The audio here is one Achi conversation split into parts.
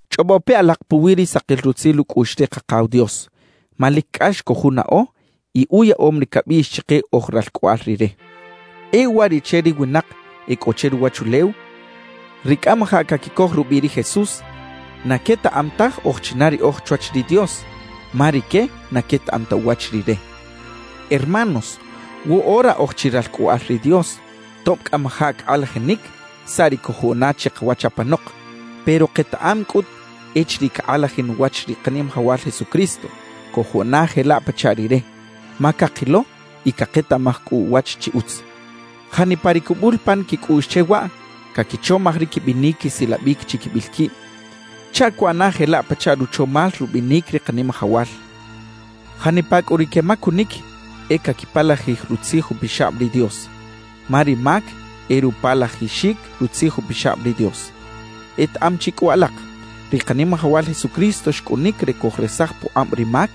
Chꞌobo pe alak puwi ri sakil rutzil ucꞌuꞌx ri Kakaw Dios, ma lic cꞌax cojunaꞌo y uyaꞌom ri cabiꞌx chike oj ralcꞌoꞌal Rire. E uwariꞌche ri winak e cꞌo che ruwachulew, ri cꞌamajaꞌ caquicoj rubiꞌ ri Jesús, na quetaꞌam taj oj china riꞌoj chwach ri Dios, ma rique na quetaꞌam ta uwach Rire. Hermanos, woꞌora oj chi ralcꞌoꞌal ri Dios, tob cꞌamajaꞌ cakꞌalajinic saꞌ ri cojuꞌana chikawach apanok. Pero ketaꞌam cꞌut echiriꞌ cakꞌalajin uwach ri Kanimajawal Jesucristo, cojuꞌana jelaꞌ pachaꞌ Rire, ma cakilo y caketaꞌmaj cꞌu uwach chi utz. Janipa ri cubul pan quicꞌuꞌx che waꞌ, caquichomaj ri quibinic quisilabic chiquibil quib chaꞌ cuꞌana jelaꞌ pachaꞌ ruchomal rubinic ri Kanimajawal. Janipa cꞌu ri quemacunic e caquipalajij Rutzij Upixab ri Dios, ma ri mac e rupalajixic Rutzij Upixab ri Dios. Etaꞌam chi cꞌu alak, ri Kanimajawal Jesucristo xcꞌunic re cojresaj pukꞌab ri mac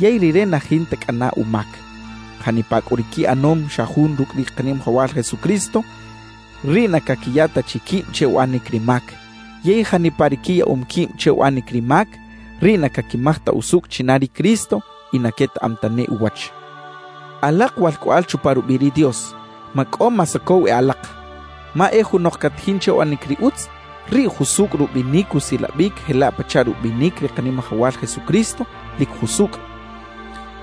yey Rire na jinta cꞌana umac. Janipa cꞌu ri quiꞌanom xa jun rucꞌ ri Kanimajawal Jesucristo, riꞌ na caquiya ta chi quib che uꞌanic ri mac. Yey janipa ri quiyaꞌom quib che uꞌanic ri mac, riꞌ na caquimaj ta usucꞌ china ri Cristo y na quetaꞌam tane uwach. Alak walcꞌoꞌal chupa rubiꞌ ri Dios, macꞌo masocow e alak. Ma e junok catajin che uꞌanic ri utz, riꞌ jusucꞌ rubinic usilabic jelaꞌ pachaꞌ rubinic ri Kanimajawal Jesucristo lic jusucꞌ.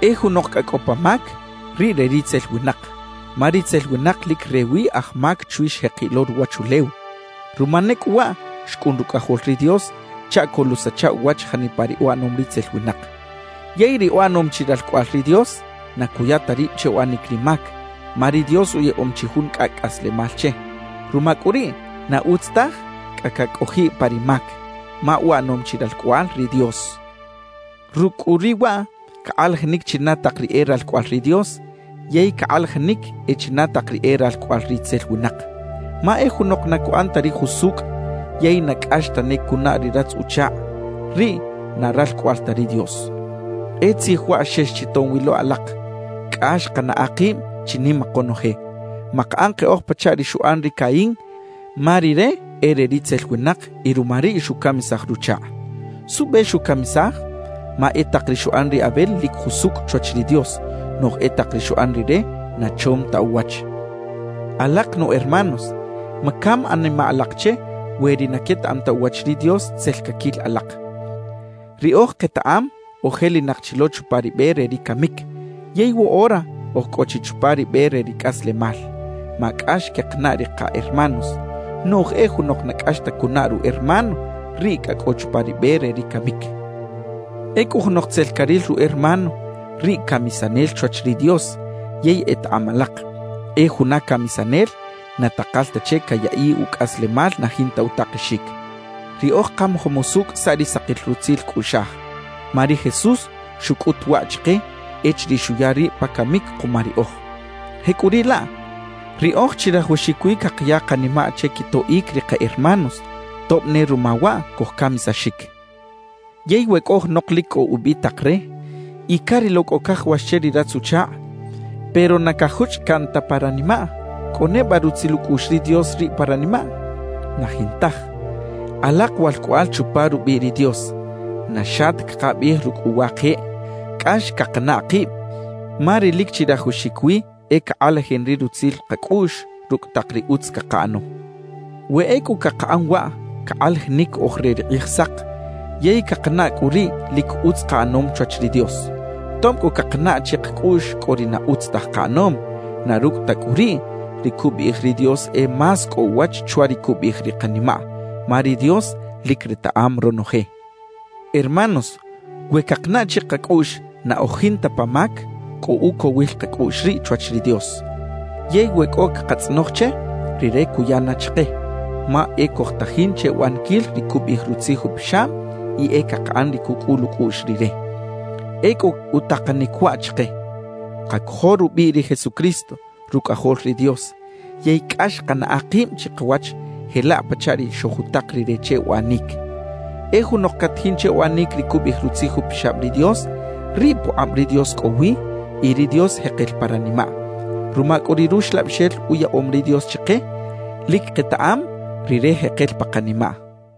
E junok cꞌa cꞌo pa mac, riꞌ re ritzel winak, ma ritzel winak lic rewi aj mac chwi xjekiꞌ lo ruwachulew. Ruma ne cꞌu waꞌ xcꞌun Rucꞌajol ri Dios chaꞌ coluꞌsacha uwach janipa ri uꞌanom ritzel winak. Yey ri uꞌanom chi ralcꞌoꞌal ri Dios, na cuya ta rib che uꞌanic ri mac, ma ri Dios uyaꞌom chi jun cꞌacꞌ cꞌaslemal che. Ruma cꞌu riꞌ, na utz taj cꞌa cacꞌojiꞌ pa ri mac, ma uꞌanom chi ralcꞌoꞌal ri Dios. Rucꞌ cꞌu riꞌ waꞌ, cakꞌalajinic china tak ri e ralcꞌoꞌal ri Dios yey cakꞌalajinic e china tak ri e ralcꞌoꞌal ritzel winak. Ma e junok na cuꞌan ta ri jusucꞌ yey na cꞌax tane cunaꞌ ri ratz-uchakꞌ, riꞌ na ralcꞌoꞌal ta ri Dios. E tzij waꞌ xex chi tom wi lo alak: Cꞌax kanaꞌa kib chinima konoje. Makaꞌan keꞌoj pachaꞌ ri xuꞌan ri Caín, ma rire e re ritzel winak y ruma riꞌ xucamisaj ruchakꞌ. ¿Suꞌbe xucamisaj? Ma e tak ri xuꞌan ri Abel lic jusucꞌ chwach ri Dios; noꞌj e tak ri xuꞌan rire na chom ta uwach. Alak nu hermanos, macam animaꞌ alak che we ri na quetaꞌam ta uwach ri Dios tzel caquil alak. Riꞌoj ketaꞌam ojelinak chi lo chupa ri be re ri camic yey woꞌora oj cꞌo chi chupa ri be re ri cꞌaslemal, ma cꞌax quekanaꞌ ri ka hermanos. Noꞌj e junok na cꞌax ta cunaꞌ ru hermano, riꞌ cꞌa cꞌo chupa ri be re ri camic. Ecꞌu junok tzel caril ru hermano, riꞌ camisanel chwach ri Dios; yey etaꞌam alak, e juna camisanel na takal ta che cayaꞌiꞌ ucꞌaslemal na jinta utakexic. Riꞌoj kamajom usucꞌ saꞌ ri sakil rutzil cꞌuꞌxaj, ma ri Jesús xucꞌut waꞌ chike echiriꞌ xuya rib pa camic kuma riꞌoj. Jecꞌuriꞌlaꞌ, riꞌoj chirajawaxic wi cakaya kanimaꞌ che quitoꞌic ri ka hermanos tob ne ruma waꞌ cojcamisaxic. Yey we cꞌo junok lic cꞌo ubitak re y carilo cꞌo cajawax che ri ratz-uchakꞌ, pero na cajuchꞌ caꞌn ta pa ranimaꞌ, ¿cꞌo neba rutzil ucꞌuꞌx ri Dios riꞌ pa ranimaꞌ? Na jintaj. Alak walcꞌoꞌal chupa rubiꞌ ri Dios, na xa ta cakabiꞌij rucꞌ uwa keꞌ cꞌax cakanaꞌ kib, ma ri lic chirajawaxic wi e cakꞌalajin ri rutzil kacꞌuꞌx rucꞌ tak ri utz cakaꞌano. We ecꞌu cakaꞌan waꞌ, cakꞌalajinic oj re ri Kꞌijsak yey cakanaꞌ cꞌu riꞌ lic utz kaꞌanom chwach ri Dios. Tob cꞌu cakanaꞌ chikacꞌuꞌx cꞌo ri na utz taj kaꞌanom, na rucꞌ ta cꞌu riꞌ, ri cubiꞌij ri Dios e más cꞌo uwach chwa ri cubiꞌij ri kanimaꞌ, ma ri Dios lic retaꞌam ronoje. Hermanos, we cakanaꞌ chikacꞌuꞌx na oj jinta pa mac, cꞌo ucowil kacꞌuꞌx riꞌ chwach ri Dios. Yey we cꞌo cakatzꞌonoj che, Rire cuya na chike, ma e cojtajin che uꞌaniquil ri cubiꞌij Rutzij Upixab y e cakaꞌan ri cucꞌul ucꞌuꞌx Rire. Ecꞌu utakanic waꞌ chike: Kacojo rubiꞌ ri Jesucristo, Rucꞌajol ri Dios, yey cꞌax kanaꞌa kib chikawach jelaꞌ pachaꞌ ri xojutak Rire che uꞌanic. E junok catajin che uꞌanic ri cubiꞌij Rutzij Upixab ri Dios, riꞌ pukꞌab ri Dios cꞌowi y ri Dios jekel pa ranimaꞌ. Ruma cꞌu ri Ruxlabixel uyaꞌom ri Dios chike, lic ketaꞌam Rire jekel pa kanimaꞌ.